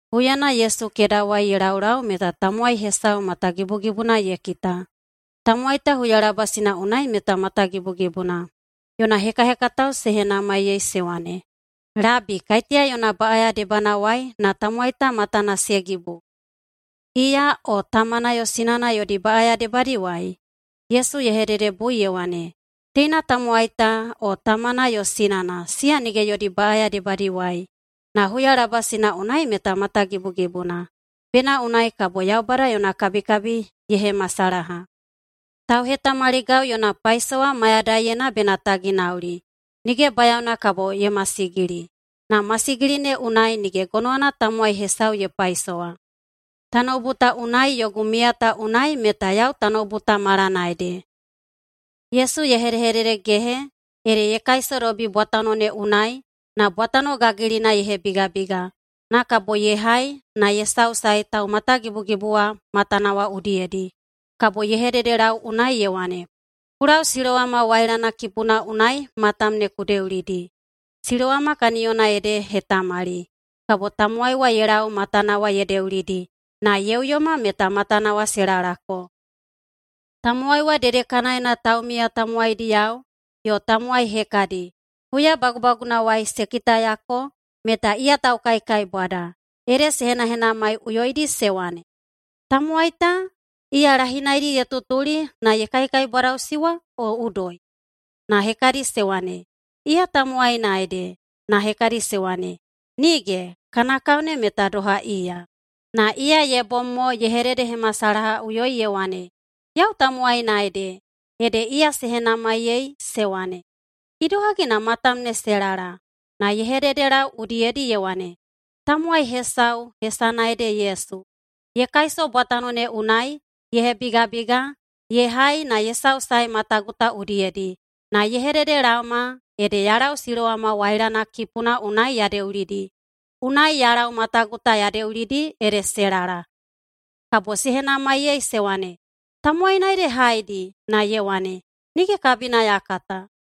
Huyana Yesu kedawai ye laulau meta tamowai hesau matagibugibuna ye kita. Tamowai ta huyalabasina unai meta matagibugibuna. Yona hekahekatao se henamaiyei se wane, “Labi, kaiteya yona baꞌaya debanawai na tamowai ta matana se gibu? Iya o tamana yo sinana yodi baꞌaya debadiwai?” Yesu ye hededebui ye wane, “Teina tamowai ta o tamana yo sinana siya nige yodi baꞌaya debadiwai. Na huyalabasina unai meta matagibugibuna, bena unai kabo Yaubada yona kabikabi ye hemasalaha. Tauhetamaligau yona paisowa mayadaiyena bena ta ginaulidi. Nige bayaona kabo ye masigili, na masigili ne unai nige gonowana tamowai hesau ye paisowa. Tanoubu ta unai yogu miya ta unai meta yau tanoubu ta malana ede.” Yesu ye hedehededegehe ede ye kaisodobi bwatano ne unai na bwatano gagilina ye hebigabiga, na kabo ye hai na ye sausae taumatagibugibu wa matana wa udiyedi. Kabo ye hededelau unai ye wane, “Ku lau Silowama wailana kipuna unai matam ne ku deulidi.” (Silowama kaniyona ede hetamali.) Kabo tamowai wa ye lau matana wa ye deulidi, na ye uyoma meta matana wa se lalako. Tamowai wa dedekanaena taumiya tamowaidiyao yo tamowai hekadi, huyabagubagunawai se kitayako meta iya taukaikaibwada, ede se henahenamaiꞌuyoidi se wane, “Tamowai ta, iya lahinaidi ye tutuli na ye kaikaibwadaꞌusi wa, o udoi?” Na hekadi se wane, “Iya tamowaina ede.” Na hekadi se wane, “Nige! Kana kao ne meta doha iya.” Na iya ye bom mo ye hedehededehemasalahaꞌuyoi ye wane, “Yau tamowaina ede.” Ede iya se henamaiyei, se wane, “Idohagi na matam ne se lala?” Na ye hededelau udiyedi ye wane, “Tamowai hesau hesana ede Yesu ye kaiso bwatano ne unai, ye hebigabiga, ye hai na ye sausae matagu ta udiyedi, na ye hededelaoma ede ya lau Silowama wailana kipuna unai ya deulidi. Unai ya lau matagu ta ya deulidi ede se lala.” Kabo se henamaiyei se wane, “Tamowaina ede haedi?” Na ye wane, “Nige kabina ya kata.”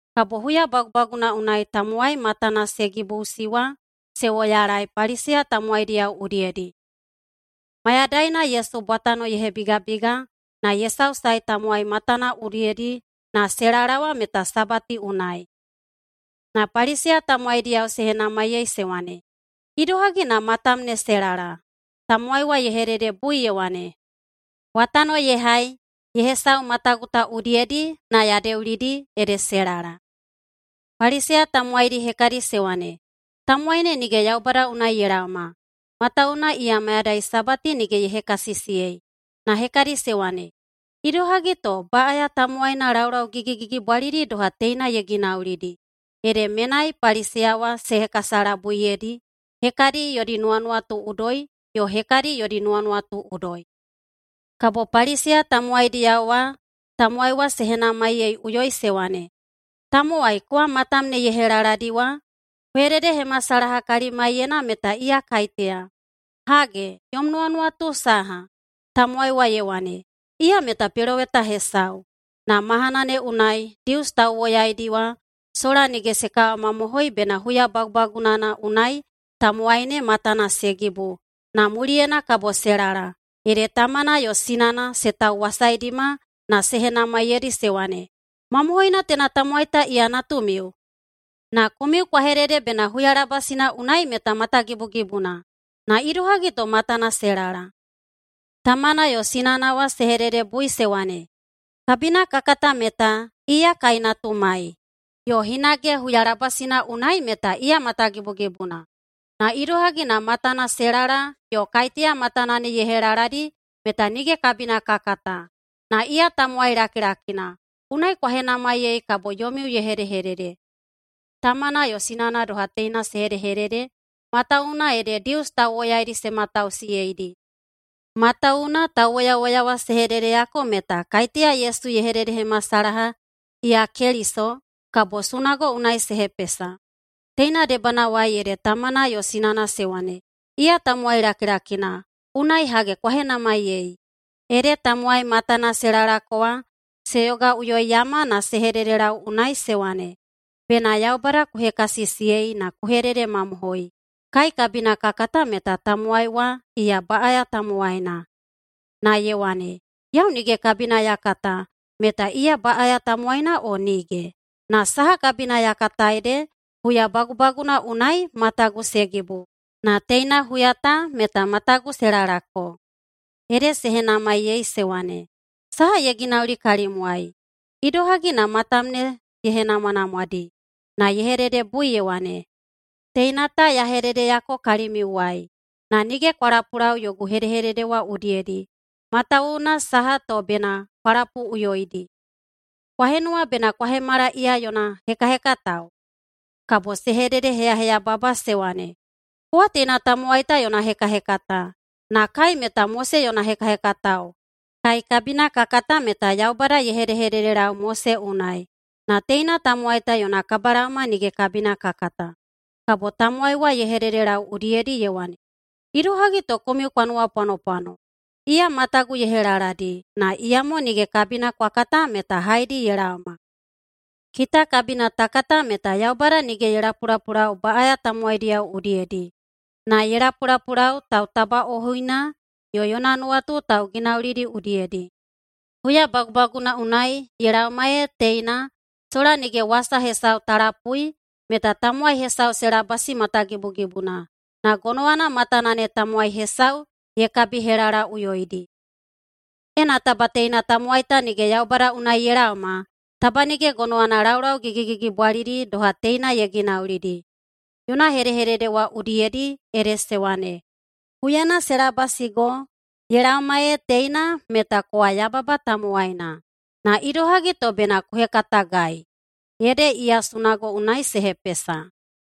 Kabo huyabagubaguna unai tamowai matana se gibuꞌusi wa se woyalae Paliseya tamowaidiyao udiyedi. Mayadaina Yesu bwatano ye hebigabiga na ye sausae tamowai matana udiyedi na se lala wa meta Sabati unai. Na Paliseya tamowaidiyao se henamaiyei se wane, “Idohagi na matam ne se lala?” Tamowai wa ye hededebui ye wane, “Bwatano ye hai ye hesau matagu ta udiyedi na ya deulidi, ede se lala.” Paliseya tamowaidi hekadi se wane, “Tamowai ne nige Yaubada unai ye laoma, matawuwuna iya mayadai Sabati nige ye hekasisiyei.” Na hekadi se wane, “Idohagi to baꞌaya tamowaina laulau gigigigibwalidi doha teina ye ginaulidi?” Ede menai Paliseya wa se hekasalabuiyedi, hekadi yodi nuwanuwatu udoi, yo hekadi yodi nuwanuwatu udoi. Kabo Paliseya tamowaidiyao wa tamowai wa se henamaiyeiꞌuyoi se wane, “Tamowai kowa matam ne ye helaladi wa, ku hededehemasalaha kalimaiyena meta iya kaiteya! Hage, yom nuwanuwatu saha?” Tamowai wa ye wane, “Iya meta peloweta hesau.” Na mahana ne unai Dius tauwoyaidi wa sola nige se kawamamohoi bena huya bagubagunana unai tamowai ne matana se gibu na muliyena kabo se lala, ede tamana yo sinana se tauwasaidima na se henamaiyeidi se wane, “Mamohoina teina tamowai ta iya natumiu? Na komiu kwa hedede bena huyalabasina unai meta matagibugibuna. Na idohagi to matana se lala?” Tamana yo sinana wa se hededebui se wane, “Kabina ka kata meta iya kai natumai, yo hinage huyalabasina unai meta iya matagibugibuna. Na idohagi na matana se lala yo kaiteya matana ne ye helaladi meta nige kabina ka kata. Na iya tamowai lakilakina, unai kwa henamaiyei kabo yomiu ye hedehedede.” Tamana yo sinana doha teina se hedehedede matawuwuna ede Dius tauwoyaidi se matausiyeidi. Matawuwuna tauwoyawoya wa se hededeyako meta kaiteya Yesu ye hededehemasalaha iya Keliso, kabo sunago unai se hepesa. Teina debanawai ede tamana yo sinana se wane, “Iya tamowai lakilakina, unai gonowana kwa henamaiyei!” Ede tamowai matana se lalako wa se yogaꞌuyoiyama na se hededelau unai se wane, “Bena Yaubada ku hekasisiyei na ku hededemamohoi! Kai kabina ka kata meta tamowai wa iya baꞌaya tamowaina.” Na ye wane, “Yau nige kabina ya kata meta iya baꞌaya tamowaina o nige. Na saha kabina ya kata ede huyabagubaguna unai matagu se gibu, na teina huya ta meta matagu se lalako.” Ede se henamaiyei se wane, “Saha ye ginauli kalimwai? Idohagi na matam ne ye henamwanamwadi?” Na ye hededebui ye wane, “Teina ta ya hededeyako kalimiuwai, na nige kwa lapulau yogu hedehedede wa udiyedi. Matawuwuna saha to bena kwa lapuꞌuyoidi? Kwa henuwa bena kwa hemala iya yona hekahekatao?” Kabo se hededeheyaheyababa se wane, “Kowa teina tamowai ta yona hekahekata, na kai meta Mose yona hekahekatao. Kai kabina ka kata meta Yaubada ye hedehededelau Mose unai, na teina tamowai ta yona kabalaoma nige kabina ka kata.” Kabo tamowai wa ye hededelau udiyedi ye wane, “Idohagi to komiu kwa nuwapwanopwano? Iya matagu ye helaladi, na iyamo nige kabina kwa kata meta haedi ye laoma. Kita kabina ta kata meta Yaubada nige ye lapulapulau baꞌaya tamowaidiyao udiyedi, na ye lapulapulau tautabaꞌohuina yo yona nuwatu tauginaulidi udiyedi. Huyabagubaguna unai ye laoma ee teina sola nige wasa hesau ta lapui meta tamowai hesau se labasi matagibugibuna na gonowana matana ne tamowai hesau ye kabihelalaꞌuyoidi. Ena taba teina tamowai ta nige Yaubada unai ye laoma, taba nige gonowana laulau gigigigibwalidi doha teina ye ginaulidi.” Yona hedehedede wa udiyedi ede se wane, “Huyana se labasigo ye laoma ee teina meta kowa yababa tamowaina, na idohagi to bena ku hekatagai?” Ede iya sunago unai se hepesa.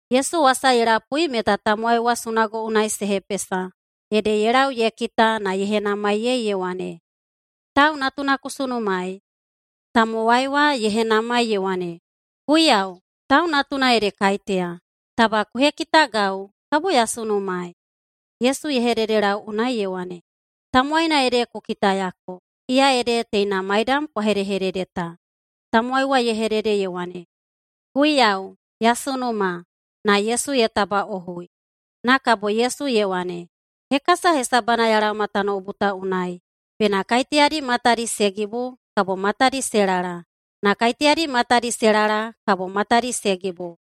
Yesu wasa ye lapui meta tamowai wa sunago unai se hepesa, ede ye lau ye kita na ye henamaiyei ye wane, “Tau Natuna ku sunumaei?” Tamowai wa ye henamai ye wane, “Guiyau, Tau Natuna ede kaiteya? Taba ku hekitagau, kabo ya sunumaei.” Yesu ye hededelau unai ye wane, “Tamowaina ede ku kitayako. Iya ede teina maidam kwa hedehedede ta.” Tamowai wa ye hedede ye wane, “Guiyau, ya sunuma!”, na Yesu ye tabaꞌohui. Na kabo Yesu ye wane, “Hekasa hesabana ya laoma tanoubu ta unai, bena kaiteyadi matadi se gibu, kabo matadi se lala, na kaiteyadi matadi se lala, kabo matadi se gibu.”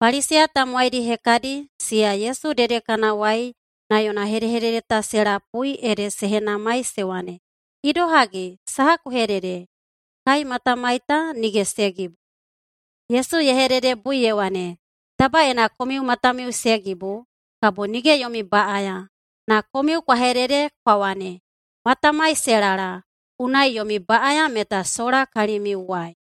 Paliseya tamowaidi hekadi siya Yesu dedekanawai na yona hedehedede ta se lapui, ede se henamaiyei se wane, “Idohagi? Saha ku hedede? Kai matamai ta nige se gibu.” Yesu ye hededebui ye wane, “Taba ena komiu matamiu se gibu, kabo nige yomi baꞌaya. Na komiu kwa hedede kwa wane, ‘Matamai se lala,’ unai yomi baꞌaya meta sola kalimiuwai.”